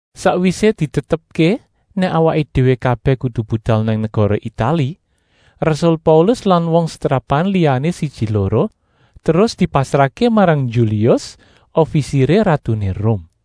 Sakwisé ditetepké nèk awaké déwé kabèh kudu budal nang negara Itali, rasul Paulus lan wong setrapan liyané siji-loro terus dipasrahké marang Yulius, ofisiré ratuné Rum.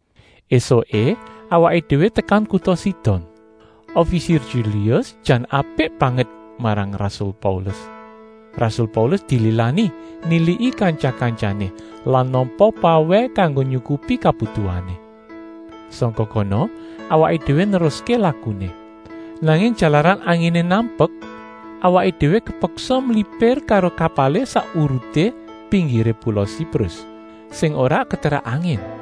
Esuké awaké déwé tekan kuta Sidon. Ofisir Yulius jan apik banget marang rasul Paulus. Rasul Paulus dililani niliki kantya-kantyané lan nampa pawèh kanggo nyukupi kabutuhané. Sangka kono awaké déwé neruské lakuné. Nanging jalaran anginé nampek, awaké déwé kepeksa mlipir karo kapalé sak uruté pinggiré pula Siprus, sing ora keterak angin.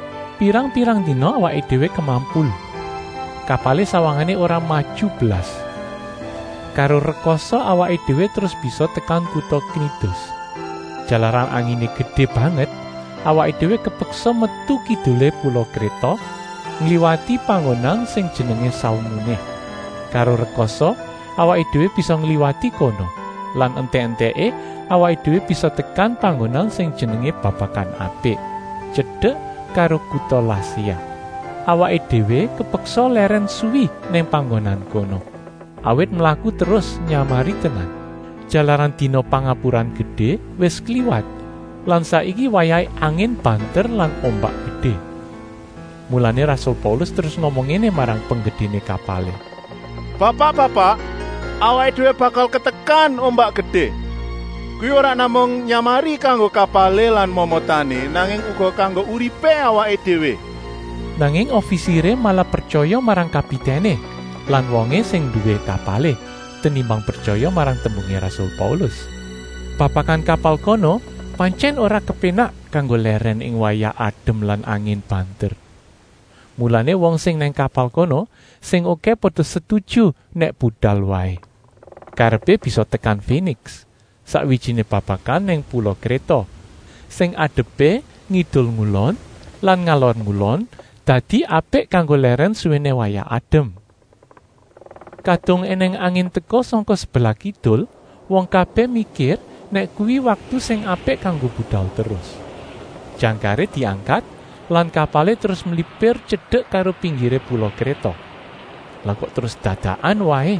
Pirang-pirang dina awaké déwé kemampul, kapalé sawangané ora maju blas. Karo rekasa awaké déwé terus bisa tekan kuta Knidus. Jalaran anginé gedé banget, awaké déwé kepeksa metu kidulé pula Kréta, ngliwati panggonan sing jenengé Salmuné. Karo rekasa awaké déwé bisa ngliwati kono lan entèk-entèké awaké déwé bisa tekan panggonan sing jenengé Babakan Apik, tyedek karo kuta Laséa. Awaké déwé kepeksa lèrèn suwi nang panggonan kono, awit mlaku terus nyamari tenan, jalaran dina Pangapuran Gedé wis kliwat lan saiki wayahé angin banter lan ombak gedé. Mulané rasul Paulus terus ngomong ngéné marang penggedéné kapalé: “Bapak-bapak, awaké déwé bakal katekan ombak gedé. Kuwi ora namung nyamari kanggo kapalé lan momotané, nanging uga kanggo uripé awaké déwé.” Nanging ofisiré malah pretyaya marang kapitèné lan wongé sing nduwé kapalé tenimbang pretyaya marang tembungé rasul Paulus. Babakan kapal kono pantyèn ora kepénak kanggo lèrèn ing wayah adem lan angin banter. Mulané wong sing nang kapal kono sing okèh pada setuju nèk budal waé. Karepé bisa tekan Féniks, sakwijiné babakan nang pula Kréta, sing adepé ngidul-ngulon lan ngalor-ngulon, dadi apik kanggo lèrèn suwéné wayah adem. Kadung ènèng angin teka sangka sebelah kidul wong kabèh mikir nèk kuwi waktu sing apik kanggo budal terus. Jangkaré diangkat lan kapalé terus mlipir tyedek karo pinggiré pula Kréta. Lah kok terus dadakan waé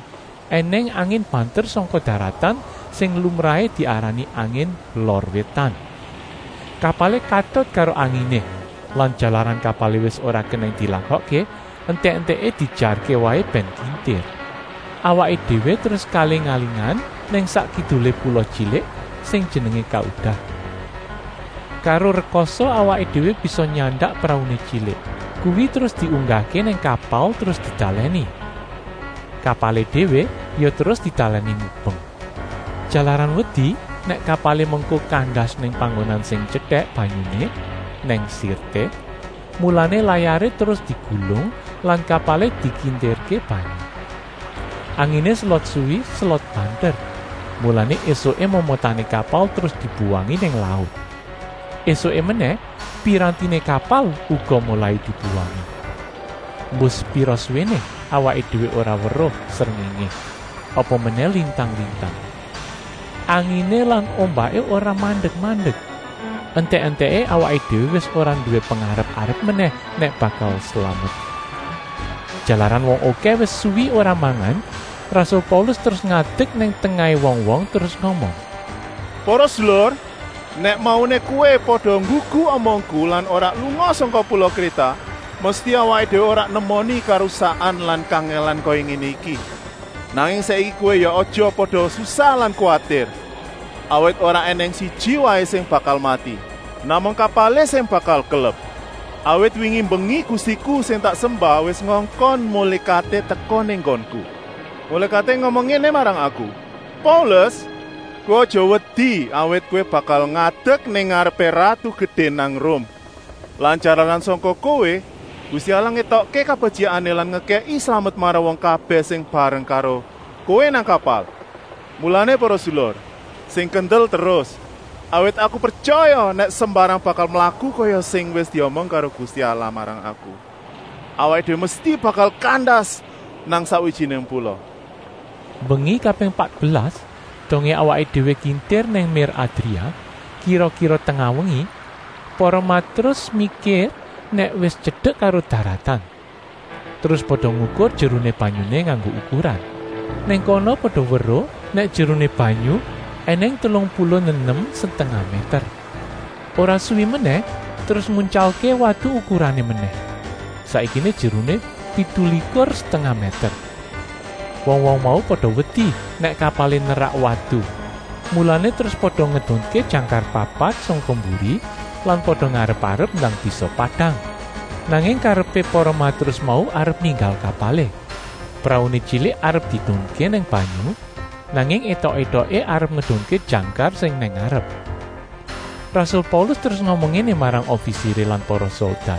ènèng angin banter sangka daratan sing lumrahé diarani angin “Lor Wétan”. Kapalé katut karo anginé lan jalaran kapalé wis ora kenèng dilakokké, entèk-entèké diejarké waé bèn kintir. Awaké déwé terus kaaling-alingan nang sak kidulé pula tyilik sing jenengé Kauda. Karo rekasa awaké déwé bisa nyandak prauné tyilik. Kuwi terus diunggahké nang kapal terus ditalèni. Kapalé déwé ya terus ditalèni mubeng. Jalaran wedi nèk kapalé mengko kandas nang panggonan sing tyetèk banyuné nang Sirté, mulané layaré terus digulung lan kapalé dikintirké banyu. Anginé selot suwi selot banter, mulané ésuké momotané kapal terus dibuwangi nang laut. Esuké menèh pirantiné kapal uga molai dibuwangi. Embuh sepira suwéné awaké déwé ora weruh srengéngé, apa menèh lintang-lintang. Anginé lan ombaké ora mandek-mandek. Entèk-entèké awaké déwé wis ora nduwé pengarep-arep menèh nèk bakal slamet. Jalaran wong okèh wis suwi ora mangan, rasul Paulus terus ngadek nang tengahé wong-wong, terus ngomong: “Para sedulur, nèk mauné kowé pada nggugu omongku lan ora lunga sangka pula Kréta, mesti awaké déwé ora nemoni karusakan lan kangèlan kaya ngéné iki. Nanging saiki kowé ya aja pada susah lan kuwatir, awit ora ènèng siji waé sing bakal mati. Namung kapalé sing bakal kelep. Awit wingi mbengi Gustiku sing tak sembah wis ngongkon mulékaté teka nang nggonku. Mulékaté ngomong ngéné marang aku: ‘Paulus, kowé aja wedi. Awit kowé bakal ngadek nang ngarepé ratu gedé nang Rum. Lan jalaran sangka kowé, Gusti Allah ngétokké kabetyikané lan ngekèki slamet marang wong kabèh sing bareng karo kowé nang kapal.’ Mulané para sedulur, sing kendel terus, awit aku pretyaya nèk sembarang bakal mlaku kaya sing wis diomong karo Gusti Allah marang aku. Awaké déwé mesti bakal kandas nang sakwijiné pula.” Mbengi kaping patbelas, dongé awaké déwé kintir nang mér Adria, kira-kira tengah wengi, para matrus mikir nèk wis tyedek karo daratan. Terus pada ngukur jeruné banyuné nganggo ukuran. Nang kono pada weruh nèk jeruné banyu ènèng telung puluh nenem setengah mèter. Ora suwi menèh terus nguntyalké watu ukurané menèh, saiki jeruné pitulikur setengah mèter. Wong-wong mau pada wedi nèk kapalé nerak watu, mulané terus pada ngedunké jangkar papat sangka mburi lan pada ngarep-arep ndang bisa padang. Nanging karepé para matrus mau arep ninggal kapalé. Prauné tyilik arep diedunké nang banyu, nanging étok-étoké arep ngedunké jangkar sing nang ngarep. Rasul Paulus terus ngomong ngéné marang ofisiré lan para soldat: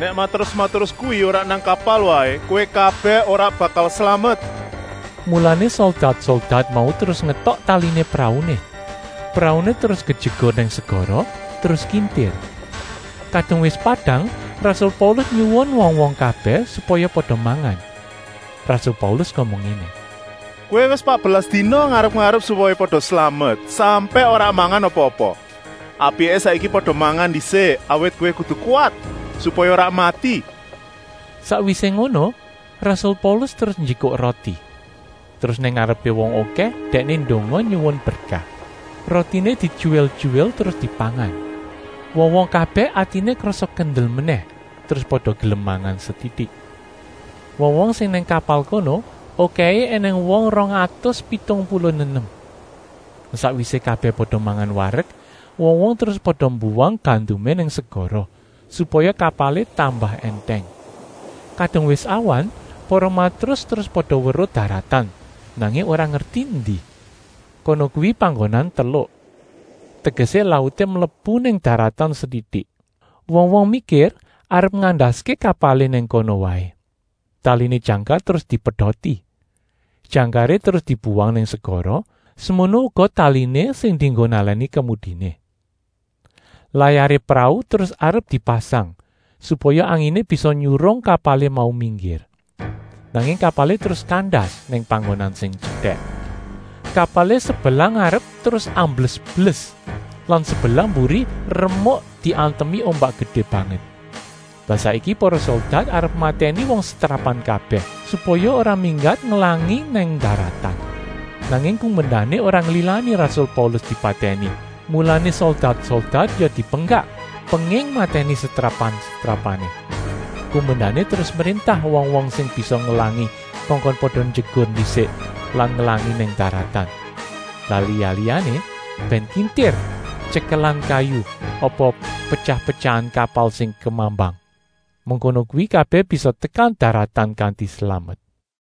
“Nèk matrus-matrus kuwi ora nang kapal waé, kowé kabèh ora bakal slamet.” Mulané soldat-soldat mau terus ngetok taliné prauné, prauné terus kejegur nang segara, terus kintir. Kadung wis padang rasul Paulus nyuwun wong-wong kabèh, supaya pada mangan. Rasul Paulus ngomong ngéné: “Kowé wis patbelas dina ngarep-arep supaya pada slamet, sampèk ora mangan apa-apa. Apiké saiki pada mangan ndisik, awit kowé kudu kuwat, supaya ora mati.” Sakwisé ngono rasul Paulus terus njikuk roti, terus nang ngarepé wong okèh dèkné ndonga nyuwun berkah. Rotiné dityuwil-tyuwil terus dipangan. Wong-wong kabèh atiné krasa kendel menèh terus pada gelem mangan setitik. Wong-wong sing nang kapal kono okèhé ènèng wong rong atus pitung puluh nenem. Sakwisé kabèh pada mangan warek, wong-wong terus pada mbuwang gandumé nang segara, supaya kapalé tambah èntèng. Kadung wis awan para matrus terus pada weruh daratan, nanging ora ngerti endi. Kono kuwi panggonan teluk, tegesé lauté mlebu nang daratan setitik. Wong-wong mikir arep ngandaské kapalé nang kono waé. Taliné jangkar terus dipedoti, jangkaré terus dibuwang nang segara, semono uga taliné sing dienggo nalèni kemudiné. Layaré prau terus arep dipasang, supaya anginé bisa nyurung kapalé mau minggir. Nanging kapalé terus kandas nang panggonan sing tyetèk. Kapalé sebelah ngarep terus ambles-bles, lah sebelah mburi remuk diantemi ombak gedé banget. Lah saiki para soldat arep matèni wong setrapan kabèh, supaya ora minggat ngelangi nang daratan. Nanging kumendané ora nglilani rasul Paulus dipatèni, mulané soldat-soldat ya dipenggak penging matèni setrapan-setrapané. Kumendané terus mréntah wong-wong sing bisa ngelangi kongkon pada njegur ndisik lan ngelangi nang daratan. Lah liya-liyané bèn kintir tyekelan kayu apa petyah-petyahan kapal sing kemambang. Mengkono kuwi kabèh bisa tekan daratan kanti slamet.